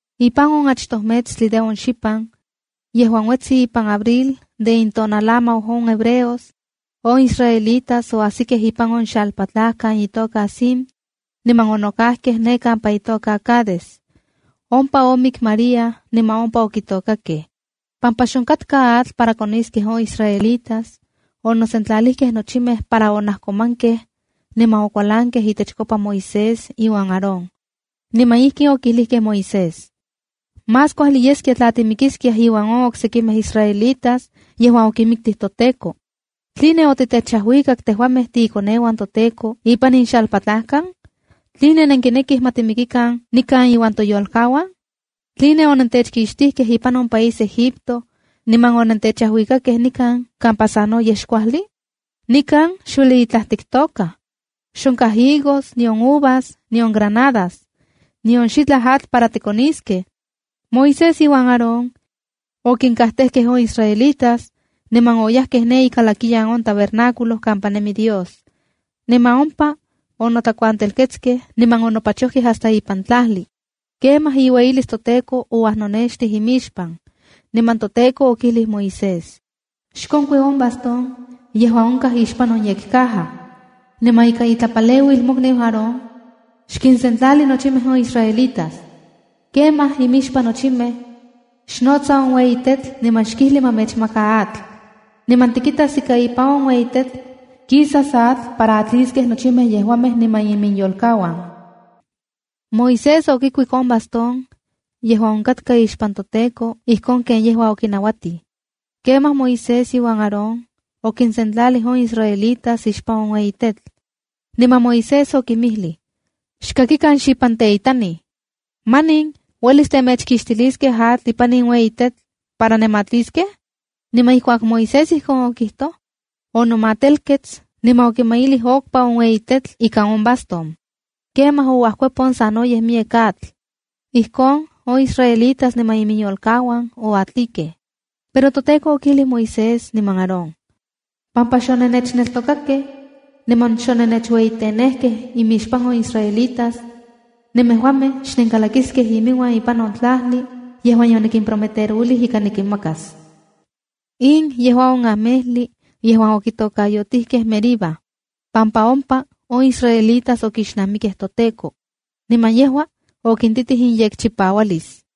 Ipan on achtoj metstli de on xipan yejuan uetsi ipan abril de intonalamau on hebreos, on israelitas oajsikej ipan on xalpatlajkan itoka Zin niman onokajkej ne kampa itoka Cades. Ompa omik María niman ompa okitokakej. Pampa xonkatka atl para koniskej on israelitas, onosentlalijkej nochimej para onajkomankej niman okualankej itechkopa Moisés iuan Aarón, niman ijkin okijlijkej Moisés: —Más kuajli yeskia tla timikiskiaj iuan on oksekimej israelitas yejuan okinmiktij toTEKO. ¿Tline onentechajuikakej tejuamej tiikoneuan toTEKO ipan in xalpatlajkan? ¿Tline nenkinekij ma timikikan nikan iuan toyolkauan? ¿Tline onentechkixtijkej ipan on país Egipto niman onentechajuikakej nikan kampa sanoyej xkuajli? Nikan xueli itlaj tiktokaj. Xonkaj higos, nion uvas nion granadas. Nion xitlaj atl para tikoniskej. Moisés iuan Aarón okinkajtejkej on israelitas, niman oyajkej ne ikalakiyan on tabernáculo kampa nemi Dios, niman ompa onotlakuantelketskej niman onopachojkej hasta ipan tlajli. Kemaj iueyilis toTEKO ouajnonextij inmixpan. Niman toTEKO okijlij Moisés: —Xkonkui on bastón yejuan onkaj ixpan on yekcaja, niman ika itlapaleuil mokniu Aarón, xkinsentlali nochimej on israelitas. Kemaj imixpan nochimej, xnotsa on ueyi tetl niman xkijli ma mechmaka atl. Niman tikitas ika ipan on ueyi tetl kisas atl para atliskej nochimej yejuamej niman iminyolkauan. Moisés okikuik on bastón yejuan onkatka ixpan toTEKO ijkon ken yejua okinauatij. Kemaj Moisés iuan Aarón okinsentlalijkej on israelitas ixpan on ueyi tetl, niman Moisés okinmijlij: —Xkakikan xipanteitanij, ¿manin uelis temechkixtiliskej atl ipan in ueyi tetl para nematliskej? Niman ijkuak Moisés ijkon okijtoj, onomatelkets niman okimailij okpa on ueyi tetl ikan on bastón. Kemaj ouajkuepon sanoyej miyek atl. Ijkon, on israelitas niman iminyolkauan oatlikej. Pero toTEKO okijlij Moisés niman Aarón: —Pampa xonennechneltokakej niman xonennechueyitenejkej imixpan on israelitas, nemejuamej xnenkalakiskej iminuan ipan on tlajli yejuan yonikimprometerouilij ika nikinmakas. In yejua on amejli yejuan okitokayotijkej Meribaa pampa ompa on israelitas okixnamikej toTEKO, niman yejua okintitij iyekchipaualis.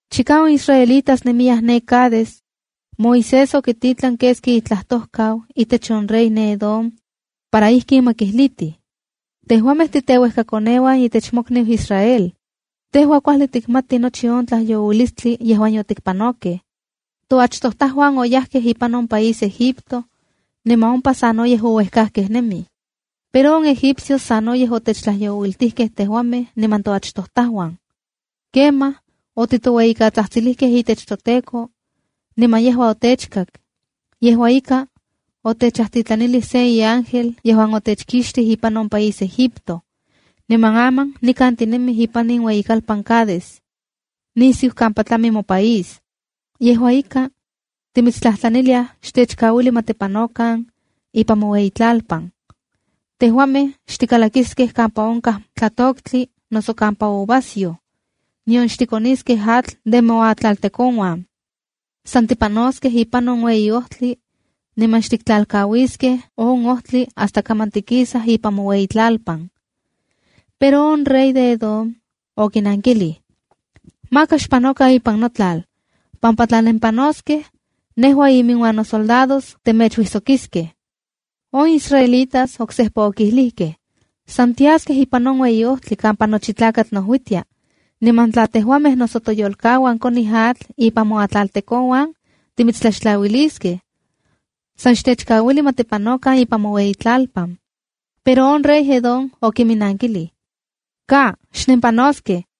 Chika on israelitas nemiyaj ne Cades, Moisés okititlan keski itlajtojkau itech on rey ne Edom para ijkin ma kijlitij: “Tejuamej titeuejkakoneuan itech mokniu Israel. Tejua kuajli tikmati nochi on tlajyouilistli yejuan yotikpanokej. Toachtojtajuan oyajkej ipan on país Egipto niman ompa sanoyej ouejkajkej nemij. Pero on egipcios sanoyej otechtlajyouiltijkej tejuamej niman toachtojtajuan. Kemaj otitoueyikatsajtsilijkej itech toTEKO, niman yejua otechkak. Yejua ika, otechajtitlanilij se iángel, yejuan otechkixtij ipan on país Egipto. Niman aman nikan tinemij ipan in ueyikalpan Cades, nisiu kampa tlami mopaís. Yejua ika, timitstlajtlaniliaj, xtechkauili ma tipanokan ipan moueyitlalpan. Tejuamej xtikalakiskej kampa onkaj tlatoktli noso kampa uvasyoj. Nion xtikoniskej atl de nemoatlaltekonuan. San tipanoskej ipan on ueyi ojtli niman xtiktlalkauiskej on ojtli hasta kaman tikisaj ipan moueyitlalpan.” Pero on rey de Edom okinnankilij: —Maka xpanokan ipan notlal, pampa tla nenpanoskej, nejua iminuan nosoldados temechuijsokiskej. On israelitas oksejpa okijlijkej: —San tiaskej ipan on ueyi ojtli kampa nochi tlakatl nojuitia, niman tla tejuamej noso toyolkauan konij atl ipan moatlaltekonuan timitstlaxtlauiliskej. San xtechkauili ma tipanokan ipan moueyitlalpan. Pero on rey de Edom okiminankilij: —¡Ka, xnempanoskej!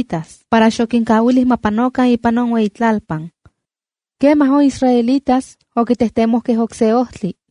para xokinkauilij ma panokan ipan iueyitlalpan. Kemaj on israelitas okitejtemojkej okse ojtli.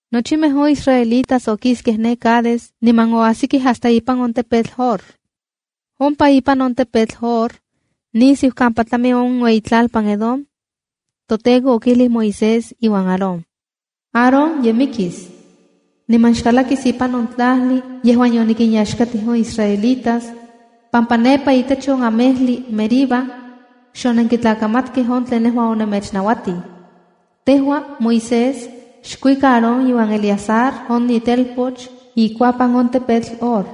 Nochimej on israelitas okiskej ne Cades, niman oajsikej hasta ipan on tepetl Hor. Ompa ipan on tepetl Hor nisiu kampa tlami on ueyitlalpan Edom, toTEKO okijlij Moisés iuan Aarón: “Aarón ye mikis. Niman xkalakis ipan on tlajli yejuan yonikinyaxkatij on israelitas, pampa nepa itech on amejli Meriba xonenkitlakamatkej on tlen nejua onemechnauatij. Tejua, Moisés, xkuika Aarón iuan Eleazar, on itelpoch ikuapan on tepetl Hor.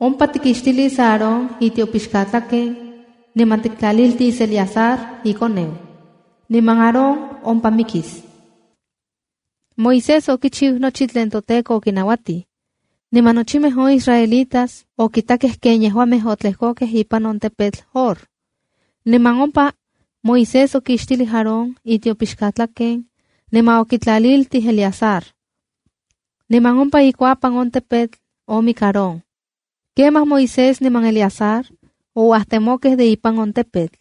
Ompa tikixtilis Aarón itiopixkatlaken, niman tiktlaliltis Eleazar, ikoneu. Niman Aarón ompa mikis.” Moisés okichiu nochi tlen toTEKO okinauatij. Niman nochimej on israelitas okitakej ken yejuamej otlejkokej ipan on tepetl Hor. Niman ompa Moisés okixtilij Aarón itiopixkatlaken niman okitlaliltij Eleazar. Niman ompa ikuapan on tepetl omik Aarón, kemaj Moisés niman Eleazar ouajtemokej de ipan on tepetl.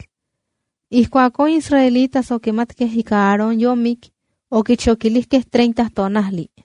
Ijkuak on israelitas okimatkej ika Aarón yomik, okichokilijkej tonajli.